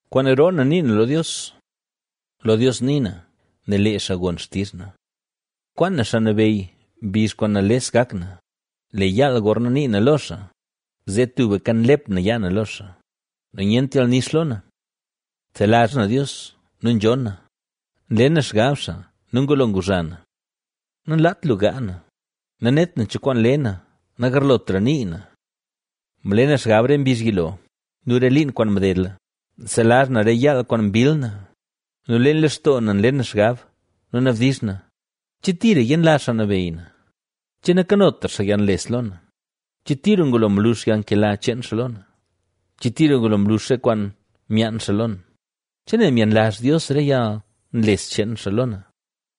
Kwaan roo na nii na lo Dios, Lo Dios nii na, nel lee xaa gon xtizh na. Kwaan na Xaa Nabeyy mbizh kwaan nales gak na; lee yaal gorna nii na lo xaa, zee tubka nlep na yaa na lo xaa nu nyent yalnix lo na. Nselazh na Dios nu nzhonn na, nle na xgab xaa nu ngulo nguzha na. Nanlaat lu gaa na; nanet na cho kwaan le na nagarlotra nii na. Mle na xgab re mbizh yilo nu re liin kwaan mdedla. Nselazh na re yaal kwaan mbill na nu leen lextoo na nle na xgab nu nabdizh na: ¿Che tira yenlazh Xaa Nabeyy na? ¿Che nakanotra xaa yalnles lo na? ¿Che tira ngulo mlux yalnkela cheen xaa lo na? ¿Che tira ngulo mlux re kwaan myaan xaa lo na? ¿Che nel myenlazh Dios re yalnles cheen xaa lo na?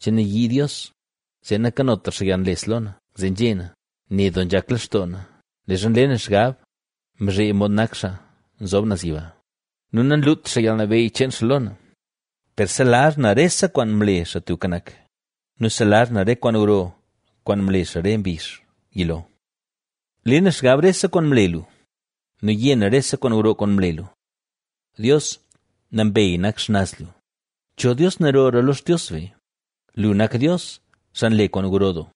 ¿Che nayii Dios, zee nankanotra xaa yalnles lo na? Zee nzhé na: “Ne doo nzhak lextoo na, leezha nle na xgab mzhee mod nak Xaa Nzob Naz Yiba, nu nanlut xaa yalnabeyy cheen xaa lo na”. Per selazh na rese kwaan mle Xaa Tubka Nak nu selazh na re kwaan gro, kwaan mle xaa re mbizh yilo. Le na xgab rese kwaan mle lu, nu yé na rese kwaan gro kwaan mle lu. Dios, nambey nak xnaz lu; ¿Cho dios narora lo Xtios be? Lu, nak Dios, xaa nle kwaan gro doo;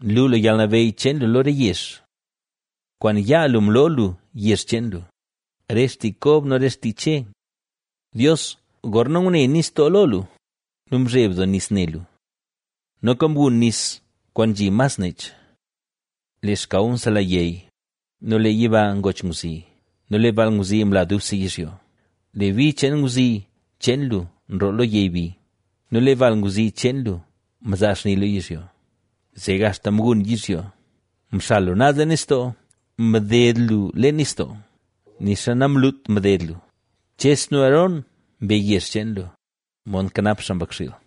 nlu lu yalnabeyy cheen lu lo re yezh. Kwaan yaa lu mloo lu yezh cheen lu, re xtii Kob nu re xtii Che. Dios, gorna ngune nistoo lo lu; nu mzheb doo nis ne lu. Noka mgun nis kwaan nzhi mas nech. Lee xkaw msela yey nu lee yiba ngoch ngwzi nu lee bal ngwzi mla dubse yizhyo. Lee bi cheen ngwzi cheen lu nroo lo yey bi nu lee bal ngwzi cheen lu mzaa xni lo yizhyo, zee axta mgun yizhyo. Mxal lu naz leen nistoo, mded lu leen nistoo, nixa namlut mded lu. Ches nu Aarón, mbe yezh cheen lu, mod nkanap xaa mbakxiil.